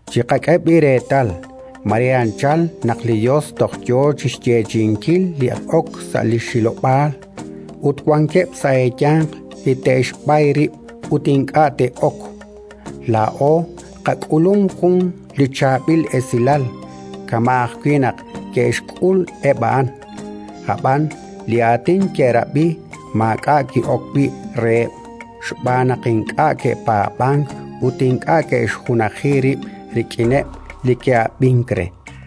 Chiqak'e b'i' reetal: mare anchal, naq li Yos toj yo chi xyeechi'inkil li ok sa' li xhilob'aal, ut wankeb' sa' eeyanq li te'xb'ay rib' ut ink'a' te'ok. Laa'o qak'ulum jun li chaab'il esilal, kama' ajwi' naq ke'xk'ul eb' a'an. Ab'an li aatin ke'rab'i maak'a' ki'ok wi' reheb', xb'aan naq ink'a' ke'paab'ank ut ink'a' ke'xjunaji rib' rik'ineb' li ke'ab'ink re.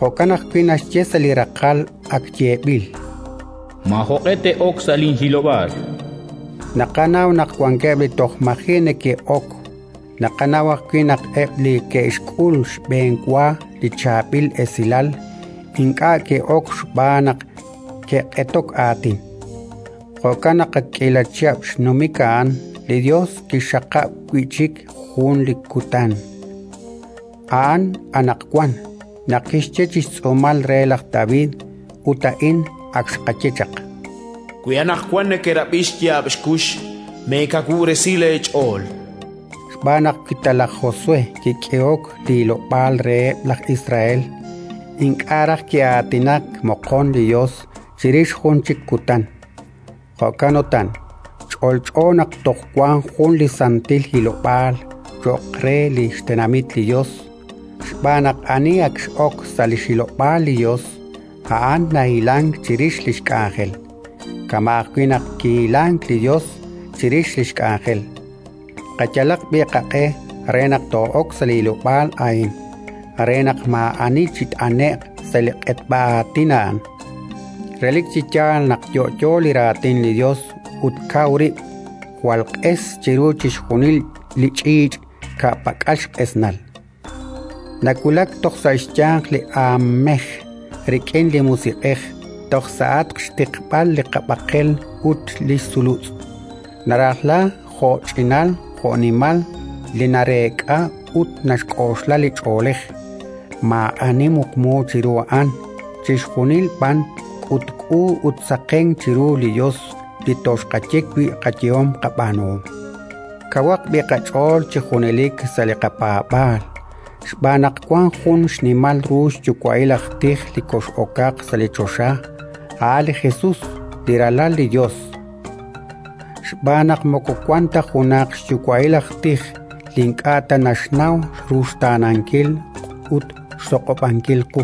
Jo'kan ajwi' naxye sa' li raqal ak yeeb'il: “Maajoq'e te'ok sa' linhilob'aal”. Naqanaw naq wankeb' li toj maji' neke'ok; naqanaw ajwi' naq eb' li ke'xk'ul xb'enwa li chaab'il esilal ink'a' ke'ok xb'aan naq ke'q'etok aatin. Jo'kan naq, ak k'iila chihab' xnumik a'an, li Yos kixxaqab' wi' chik jun li kutan: a'an “anaqwan”, naq kixye chi xtz'uumal re laj David (ut a'in ak xqaye chaq): “Wi anaqwan nekerab'i xyaab' xkux, meekawub'resi leech'ool”. Xb'aan naq wi ta laj Josué kik'ehok li hilob'aal reheb' laj Israel, ink'a' raj ki'aatinak moqon li Yos chirix jun chik kutan. Jo'kan utan, ch'olch'o naq toj wank jun li santil hilob'aal cho'q re li xtenamit li Yos. Xb'aan naq ani ak x'ok sa' li xhilob'aal li Yos, a'an nahilank chirix li xk'anjel, kama' ajwi' naq kihilank li Yos chirix li xk'anjel. Qayalaq b'i' qaq'e re naq too'ok sa' li hilob'aal a'in re naq maa'ani chit'ane'q sa' li q'etb'a aatin a'an. Relik chi yaal naq yo'yo li Raatin li Yos ut kaw rib', jwal q'es chiru chixjunil li ch'iich' ka'pak'al xq'esnal. Nawulak toj sa' xyanq li aanmej rik'in li musiq'ej, toj sa'atq xtiqb'al li qab'aqel ut li sulutz; narajla jo'ch'inal jo'nimal li nareek'a ut naxk'oxla li ch'oolej. Maa'ani muqmu chiru a'an, chixjunil b'an k'utk'u ut saqenk chiru li Yos li toxqaye wi' qayehom qab'aanuhom. Kawaq b'i' qach'ool chi junelik sa' li qapaab'aal, xb'aan naq wank jun xnimal ru xyuwa'il aj tij li kox'okaq sa' choxa, a' li Jesus, li Ralal li Yos. Xb'aan naq moko wank ta junaq xyuwa'il aj tij li ink'a' ta naxnaw ruxtaanankil ut xtoq'ob'ankil qu;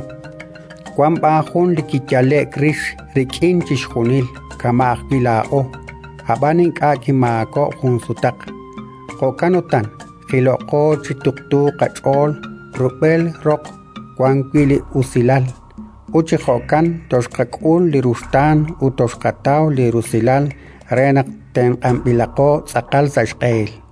wank b'an jun li kiyale'k rix rik'in chixjunil kama' ajwi' laa'o, ab'an ink'a' kimaakob'k jun sutaq. Jo'kan utan, jiloqo chi tuqtuuq qach'ool rub'el roq wan wi' li usilal; ut chi jo'kan toxqak'ul li ruxtaan ut toxqataw li rusilal re naq tenq'anb'ilaqo tz'aqal sa' xq'ehil.